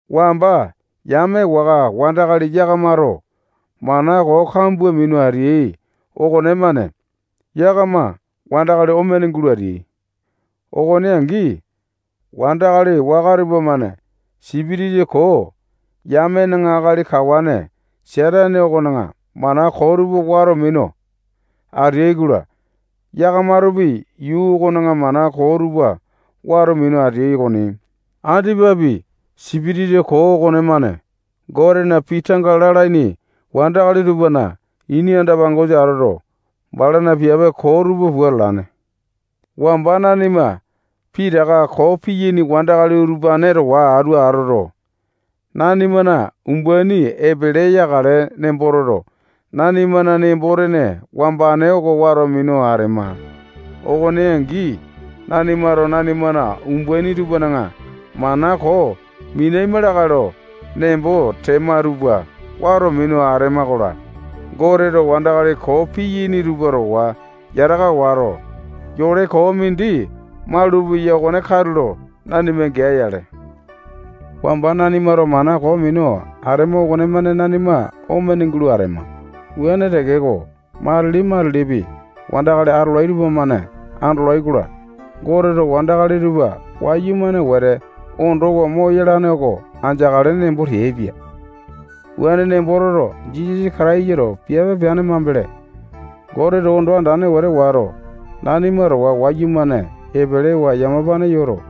Wamba yame waka wandakali yakamato mana koo kambua minu ateai okonemane yakama wandakali omene gulo ateai. Okone angi, wandakali waka tupamane sipitisa koo yamena akali kawane Satane okona mana koo tupa wato minu ateai-kola, yakamatopi yuu okona mana koo tupa wato minu ateai okoni. Andipapi, sipitisa koo okonemane Gotena pii tanga lalaini wandakali tupana ini anda-pangosa atoto, balana piape koo tupa pua atalane. Wamba nanima pitaka koo piyaini wandakali utupane towa atu atoto, nanimana umbaini epele yakale nembo toto, nanimana nembo-tene wambane oko wato minu atema. Okone angi, nanimato nanimana umbaini tupana mana koo minaima lakae lo nembo tema tupa wato minu atema-kola, Goteto wandakali koo piyaini tupa towa yataka wato, yole koo mindi malupeya okone katulo nanima gea-yale. Wamba nanimato mana koo minu atema okonemane nanima omene gulo atema. Wuane tekeko, matili-matilipi wandakali atolai tupamane andolai-kola, Goteto wandakali tupa wayumane wete ondowa moyalane oko andeakale nembo teaipia. Wuane nembo toto, Jisasa Kataisato piape peane mambele, Goteto ondo andane wete wato, nanima towa wayumane epelewa yamapane yoto,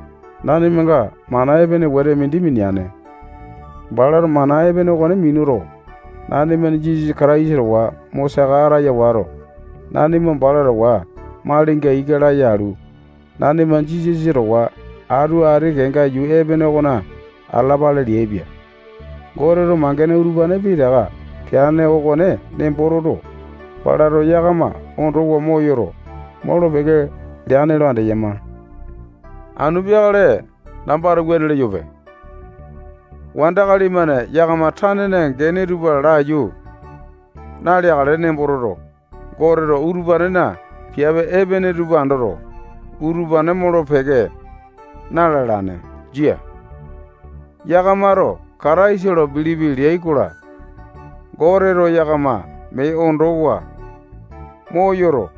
nanimanga mana epene wete mindi mineane. Balato mana epene okone minuto, nanima Jisasa Kataisa towa mo saka ataya wato, nanima bala towa malinga ika laya alu, nanima Jisasa towa atu ati kenga yuu epene okona atalapale leaipia. Goteto mangene utupane pitaka peane okone nembo toto, balato yakama ondowa moyoto, molo-peke leane lo andeyama. Anu peakale nambato wuane leyope. Wandakali-mane yakama tanena gene tupa laiyu naleakale nembo toto, Goteto utupanena piape epene tupa andoto, utupane molo-peke na-lalane. Jia. Yakamato Kataisa lo bilipi leai-kola, Goteto yakama mee ondowa moyoto,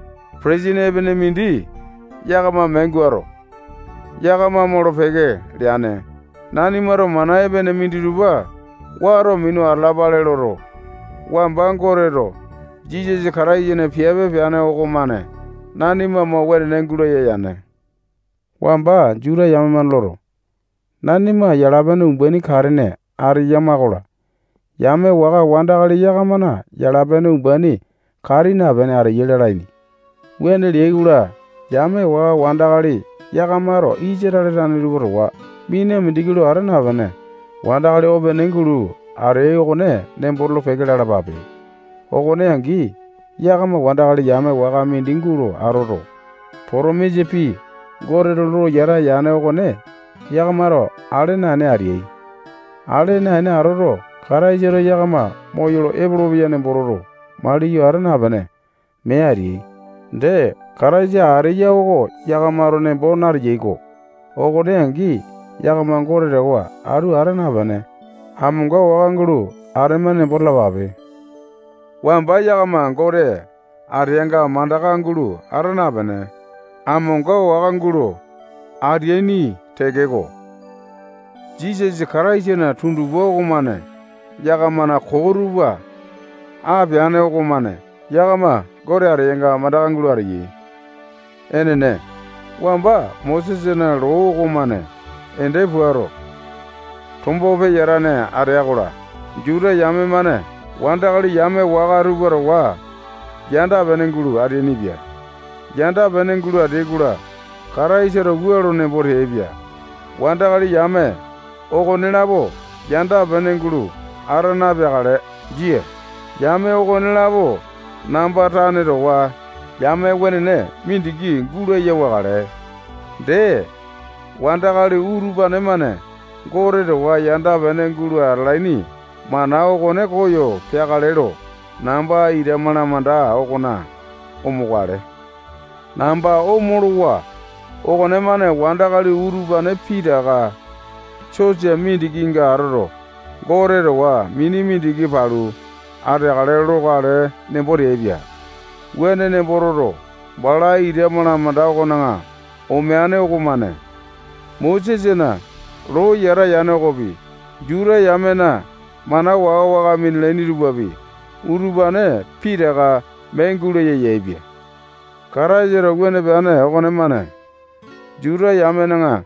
petesini epene mindi yakama mee guato, yakama molo-peke leane. Nanimato mana epene minditupa wato minu atalapale loto, wamba Goteto Jisasa Kataisana piape peane okomane nanima mo wenene gulaya yane. Wamba Juta yame-mane loto, nanima yala-pene umbaini katene ateyama-kola, yame waka wandakali yakamana yala-pene umbaini kati napene ateyai lalaini. Wuane leai-kola, yame waka wandakali yakamato Isatale tane tupa towa mina mindiki lo ata napene, wandakali opene gulo ateai okone nembo tolo-peke lalapape. Okone angi, yakama wandakali yame waka mindi gulo atoto, potomisa pii Goteto lo yata yane okone yakamato ale naene ateai. Ale naene atoto, Kataisato yakama moyolo epolopeya nemboto maliyo ata napene, mee ateai. Dee, Kataisa ateya oko yakamato nembo nateai-ko. Okone angi, yakama Gote towa atu ata napene, amonga waka gulo atema nembo talapape. Wamba yakama Gote ateanga mandaka gulo ata napene, amonga waka gulo ateaini tekeko, Jisasa Kataisana tundupa okomane yakamana koo tupa apeane okomane yakama Gote ateyanga mandaka gulo ateyai. Enene, wamba Mosesana loo okomane ende puato, tombo peyatane atea-kola, Juta yame-mane wandakali yame waka tupa towa yanda-pene gulo ateainipia. Yanda-pene gulo ateai-kola, Kataisato wua lo nembo teaipia: Wandakali yame okonelapo yanda-pene gulo ata napeakale. Jia. Yame okonelapo namba tane towa yame wenene mindiki gulaya wakale. Dee, wandakali utupane-mane Gote towa yanda-pene gulo atalaini mana okone koyo peakale lo namba ita malamanda okona omokale. Namba omolowa okonemane wandakali utupane pitaka sosa mindikinga atoto, Gote towa mini mindiki palu ateakale lokale nembo teaipia. Wuane nembo toto, bala ita malamanda okona omeane okomane Mosesana loo yata yane okopi, Juta yamena mana waka-waka minalaini tupapi, utupane pitaka mee gulaya yaepia. Kataisato wuane peane okomane Juta yamena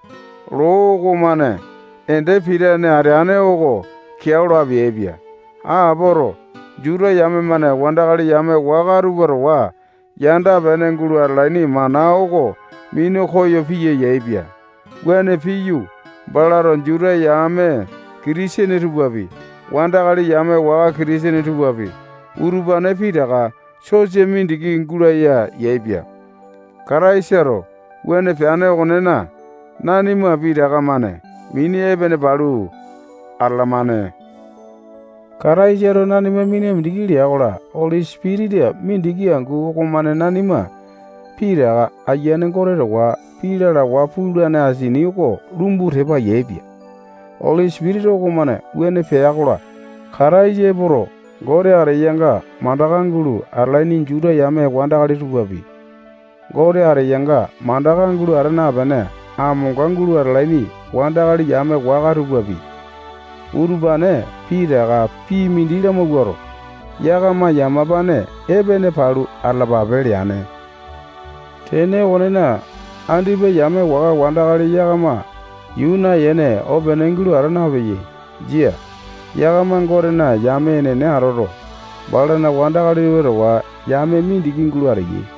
loo okomane ende pitane ateane oko keao lo apeaipia. Apoto, Juta yame-mane wandakali yame waka tupa towa yanda-pene gulo atalaini mana oko minu koyo piya yaepia. Wuane piyu, balato Juta yame Kitisene tupapi, wandakali yame waka Kitisene tupapi, utupane pitaka sosa mindiki gulaya yaepia. Kataisato wuane peane okonena, nanima pitaka-mane mini epene palu atalamane. Kataisato nanima mina mindiki lea-kola, Oli Sipitisa mindiki angu okomane nanima pitaka Ayiane Gote towa pii lalawa pulane asini oko lumbu tepa yaepia. Oli Sipitisa okomane wuane pea-kola, Kataisa epoto, Gote ateyanga mandaka gulo atalaini Juta yame wandakali tupapi, Gote ateyanga mandaka gulo ata napene, amonga gulo atalaini wandakali yame waka tupapi, utupane pitaka pii mindi lamawuato, yakama yamapane epene palu atalapape leane. Tene okonena, andipa yame waka wandakali yakama yuu nayene opene gulo ata napeyai. Jia. Yakama Gotena yame enene atoto, balana wandakali tupa towa yame mindiki gulo ateyai.